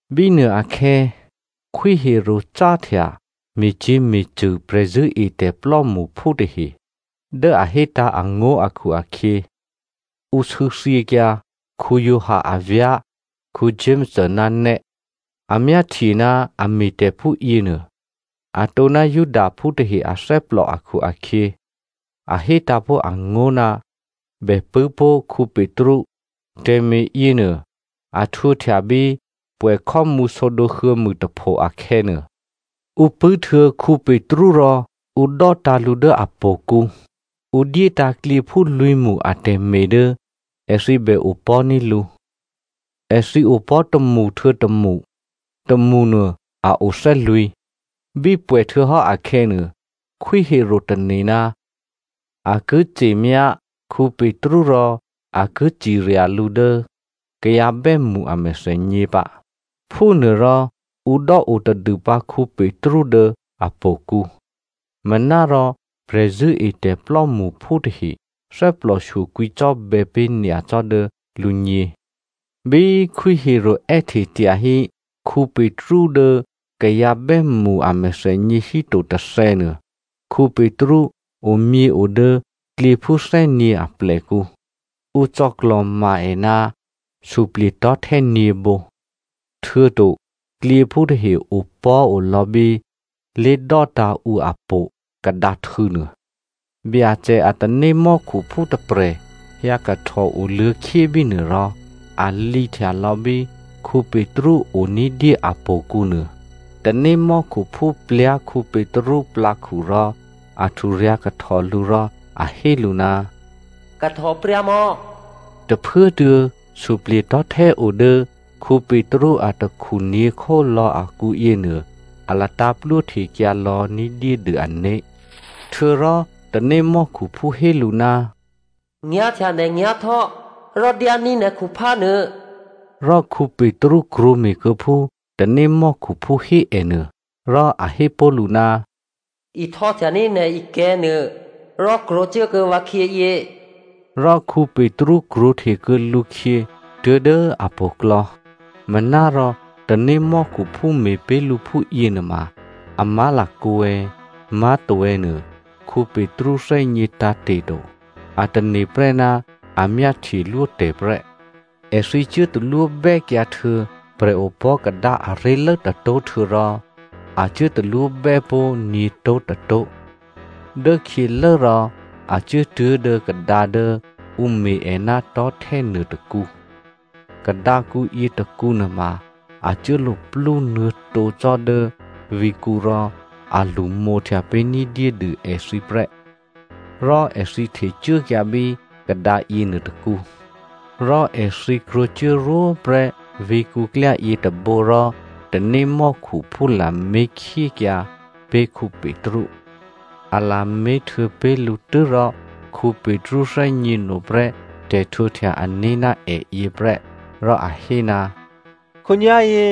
Bínuôakhè̌ Khwí Herodè cáhtya me̤cyě̤me̤cṳ̂ prè̤zṳ̂́etè̤ plò́mṳphú tahe. Dố a hétǎ̤ angó̤ akhu-akhyě, ǔ sû̌thyěkyǎ Giovanni avyá̤ Jakomo ná nè́. A myáhtye ná a me̤tè̤ phúyěnuô, atǒ ná Judaphú tahe athè́plò akhu-akhyě, a hé tǎ̤pó̤ angó̤ ná bè pṳ̂́ pó̤ Petru. Tè̤me̤ yěnuô a htwǒhtya bí pwè̌khò́mǔ sǒdǒ huô̌mûtapho akhè̌nuô. Ǔ pṳ̂́ htuô̌ Petru rò ǔ dò́tǎ̤ lǔ dố htò̌kǔ. Ǔ dyétǎ̤ klyěphú lwǐ̤mṳ atè̤me̤ dố èthǐ bè opò̤́ní̤ lǔ. Èthǐ opò̤́ tômṳ htuô̌ tômṳ. Tômṳnuô a o thè́lwǐ̤. Bí pwè̌ htuô̌hò́ akhè̌nuô, Khwí Herodè tane̤ ná a ki ce̤myá Petru rò a ki cirya lǔ dố kayǎ bè́mṳ a mèthènyě pǎ. Phúnuôrò ǔ dò́o tadû pǎ Petru dố htò̌kǔ. Manárò prè̤zṳ̂́etè̤ plò́mṳphú tahe thè́plòshyo kwǐcò́bè̌ pé̤ nyacò́ dố lǔgně. Bí Khwí Herodè è́hte tyahí Petru dố kayǎ bè́mṳ a mèthènyě híto tôthè̌nuô, Petru omyěo dố klyěphú thè́nyě̤ aplèkǔ. Ǔ cò̌klò̤ma è ná suplye̤tò̤́htè́ nyě̤bǒ. Htuô̌to klyěphú tahe opò̤́ olò̌ bí lé̤dò́tǎ̤ ǔ htò̌ kadǎhtû̌nuô. Byacè a tanémò́khuphú tôprè̤ hyǎ kahtò oluô̌khyé bínuô rò a lǐhtya lò̌ bí Petru o ní̤dyé a po̤kǔnuô. Tanémò́khuphú plyá̤ Petru plǎkhu rò a hturyǎ̤kahtò lǔ rò a hé lǔ, “kahtòpryǎmò̌” tôphuốtuô̌ suplye̤tò̤́htè́ o dố Petru atakhu nyě̤khólò̌ akǔ yěnuô a latǎ̤ plwóhtekyǎ lò̌ ní̤dyédû ané̤. Htuô̌rò tanémò́khuphú hé lǔ, “Nyá̤htya nè̤ nyá̤htò́ rò dyání̤ nè̤ khuphánuô.” Rò Petru krwǒme̤kuô̌ phú tanémò́khuphú hé è nuô. Rò a hé pó̤ lǔ, “Ihtò́htyaní̤ nè̤ ikè̤̌nuô rò krwǒcuốkuô̌ vǎkhyěyě.” Rò Petru krwǒhte kuô̌ lǔkhyě tuố̤dố htò̌klò̌. Manárò tanémò́khuphú me̤pé̤ lǔ phú yěnuôma a má̤lakǒ è̌, má̤to è̌ nuô Petru thè́gně tǎ̤te̤ to. A tane̤prè́ ná a myáhtyelwótè̤ prè́. Èthǐ cuốtalwóbè́kyǎhtuô̌ prè̤opò̤́kadǎ aré̤lố tôtó̤ htuô̌rò a cuố talwóbè́ pó̤ nyě̤tó̤tôtó̤. Dốkhyělố rò a cuốtuố̤ dố kadǎ dố ǔ me̤ è ná tò̤́htè́ nuôtôkǔ. Kadǎkǔ yětôkǔnuô ma a cuốluplú nuô̌tǒ cò́ dố vǐ̤kǔ rò a lṳmǒhtya pé̤ ní̤dyédû èthǐ prè́, rò èthǐ htecuốkyǎ bí kadǎ yěnuôtôkǔ. Rò èthǐ krwǒcuốrwó prè́ vǐ̤kǔklyá yětôbǒ rò tanémò́khuphú lamé̤khyékyǎ pé̤ Petru. A lamé̤htuô̌ pé̤ lǔ tû́rò Petru thè́gněno prè́ tè̤htwǒhtya-ané̤ ná èyě prè́ rò a hé, “Khǒnyá̤yě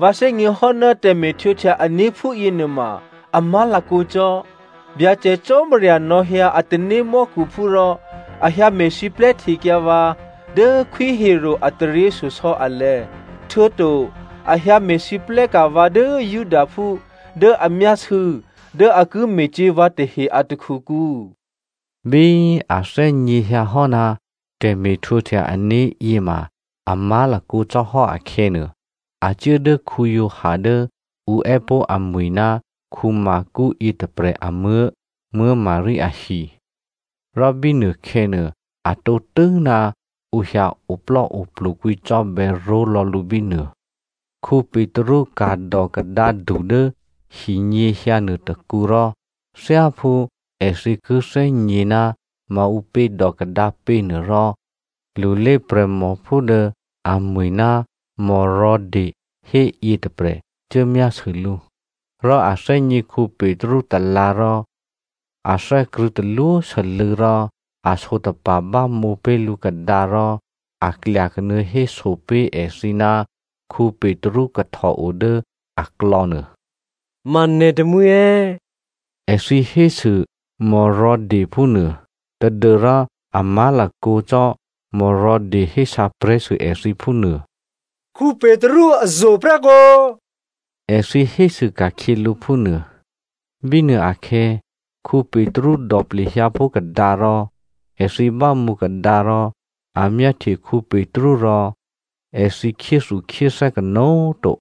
vǎ thè́gněhò́ ná tè̤me̤htwǒhtya ané̤ phúyěnuôma a má̤lakǒ cò́. Byacè Cò́marya nò̌hyǎ a tanémò́khuphú rò a hyǎ me̤siplè́ htekyǎ vǎ dố Khwí Herodè a taryěshyosò̌ alè̤̌, htuô̌to a hyǎ me̤lwóhteka̤ vǎ dố Judaphú dố a myásû̌ dố a ki me̤cyě̤ vǎ tahe a takhukǔ.” Bí a thè́gněhyǎhò́ ná tè̤me̤htwǒhtya ané̤yě ma a má̤lakǒ cò́ hò́ akhè̌nuô, a cuố dố Giovanni dố ǔ è́pó̤ amwi̤ ná Marko yětôprè̤ amuố̤ Maria ahi, rò bínuôkhè̌nuô, a tǒtû́ ná ǔ hyǎ oplò́oplu kwǐcò́bè̌ ró̤lò̌ lǔ bínuô. Petru ka̤dò kadǎdu dố hinyěhyǎnuô tôkǔ rò thyáphú èthǐ ki thè́gně ná maǔpě dò kadǎ pě nuô rò lulé prè̤mòphú dố amwi̤ ná Rhoda hé yětôprè̤ cuốmyásû lǔ. Rò a thè́gně Petru talǎ̤ rò a thè́krṳ̂̌ talwósû́lû̌ rò a sǒtapa̤ bámǒ pé̤ lǔ kadǎ rò a klyakanuô̌ héso pé̤ èthǐ ná Petru kahtòo dố aklò̌nuô. “Ma nè̤ tamwǐ è̌?” Èthǐ hésû Rhoda phúnuô, tadû́rò a má̤lakǒ cò́ Rhoda hésǎprè̤́sû èthǐ phúnuô. “Petru azo̤ prè́kǒ” èthǐ hésû ka̤khyě lǔ phúnuô. Bínuôakhè̌ Petru dò plehyǎ pó̤ kadǎ rò èthǐ bámǒ kadǎ rò a myáhtye Petru rò èthǐ khyéthukhyéthè́ kanó̤꤮ to.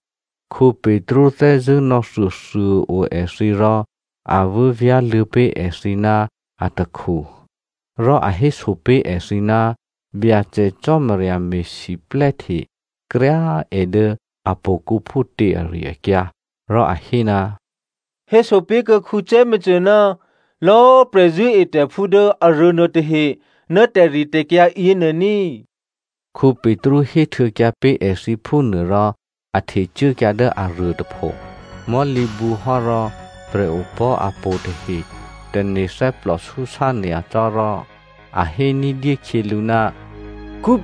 Petru thè́zṳ̂́ nò̌thuôthuô꤮ o èthǐ rò a vû́vyá̤luô̌ pé̤ èthǐ ná atakhu. Rò a héso pé̤ èthǐ ná Byacè Cò́marya me̤siplè́hte kryá꤮ è dố htò̌kǔ phútě ari-akyǎ. Rò a hé, “Héso pé̤kuô̌ Jakomo ná lò̌꤮ prè̤zṳ̂́etè̤phú dố aruô nuôtahe ná tè̤ritè̤kyǎ yěnuô ní꤮,” Petru héhtuô̌kyǎ pé̤ èthǐ phúnuô rò a htecuốkyǎ dố aruô tôpho. Mò̤́lǐbǔ hò́ rò prè̤opò̤́ htò̌ tahe tane̤ thè́plòsúsá nyacò́ rò a hé ní̤dyé khyě lǔ,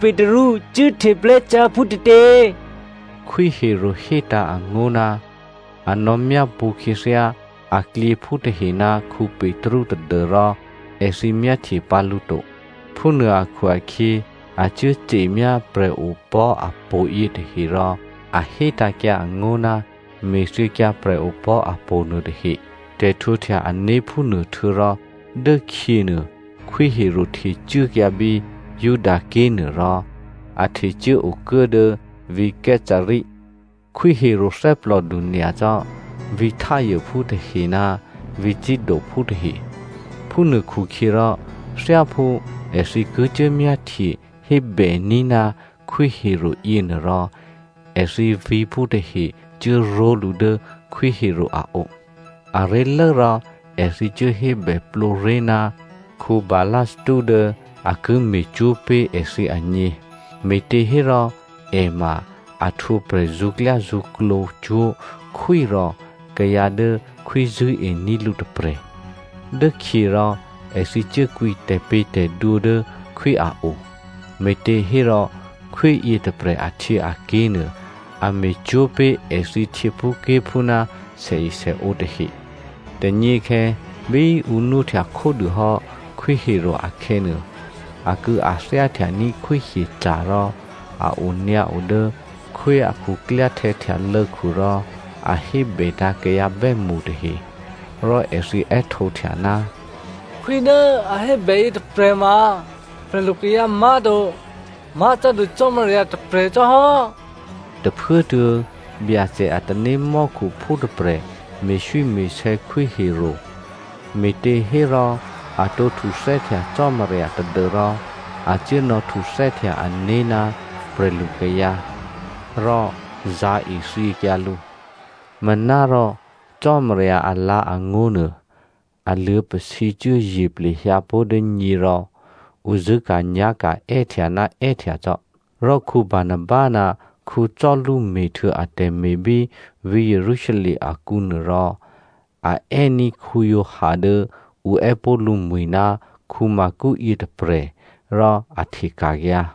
“Petru cuốhteplè́cyá̤ phútětě?” Khwí Herodè hétǎ̤ angó̤, a nò̌ myápṳ̌ khyěthyá aklyěphú tahe ná Petru tadû́rò èthǐ myáhtye pǎ lǔ to. Phúnuô akhu-akhyě a cuố ce̤myá prè̤opò̤́ htò̌ yětahe rò a hétǎ̤kyǎ angó̤ ná me̤thyěkyǎ prè̤opò̤́ htò̌ nuôtahe. Tè̤htwǒhtya-ané̤ phúnuô htuô̌rò dốkhyěnuô Khwí Herodè htecuốkyǎ bí Judaké̤nuô rò a htecuố okuố dố vǐ̤ Caesarea. Khwí Herodè thè́plòdu nyacò́ vǐ̤ Tyrephú tahe ná vǐ̤ Sidophú tahe. Phúnuôkhukhyěrò thyáphú èthǐ ki cuốmyáhtye hébèní̤ ná Khwí Herodè yěnuôrò èthǐ vǐ̤phú tahe cuốró̤lǔ dố Khwí Herodè a o. Aré̤lố rò èthǐ cuốhébè plǒré̤ ná Blasto dố a ki me̤cwó̤ pé̤ èthǐ agně, me̤těhérò è ma a htwǒ prè̤zṳ̌klyázṳ̌klǒ cwó̤ khwí rò kayǎ dố khwí zṳ̂́ení̤ lǔ tôprè̤. Dốkhyě rò èthǐ cuốkwǐ tè̤pě̤tè̤dwǒ dố khwí a o, me̤těhérò khwí yětôprè̤ ahtyěaké̤ nuô, a me̤cwó̤ pé̤ èthǐ htyěphúké̤phú ná sèesèǒ tahe. Tônyěkhè̌ bí ǔ nwóhtya khódû hò́ Khwí Herodè akhè̌nuô, akû̌athyáhtyaní̤ khwíhyeca̤ rò a onyǎo dố khwí a khuklyáhtè̌htyalô̌khu rò a hébètǎ̤ kayǎ bè́mṳ tahe. Rò èthǐ è́htǒhtya, “Khwí dố a hébè yětôprè̤ ma prè̤lukayǎ má̤to. Má̤cò́dû cò́marya tôprè̤ cò́hò́.” Tôphuốtuô̌, Byacè a tanémò́khuphú tôprè̤ me̤swíme̤sè̌ Khwí Herodè, me̤těhérò a tǒ htuthè́htya Cò́marya tadû́rò a cuố nò̌htuthè́htya ané̤ ná prè̤lukayǎ. Rò zǎ̤ ethyěkyǎ lǔ. Manárò Cò́marya alǎ̤angó̤nuô, a luô̌pasǐcuố ye̤ plehyǎpó̤ dố nyě rò ǔ zṳ̂́ka̤nyá̤ka̤ è́htya ná è́htya cò́. Rò Barnaba ná Saulu me̤htuô̌ atè̤me̤ bí vǐ̤ Jerusalem akǔ nuôrò a è́ní̤ Giovanni dố ǔ è́pó̤ lǔmwi̤ ná Marko yětôprè̤ rò a hteka̤kyǎ.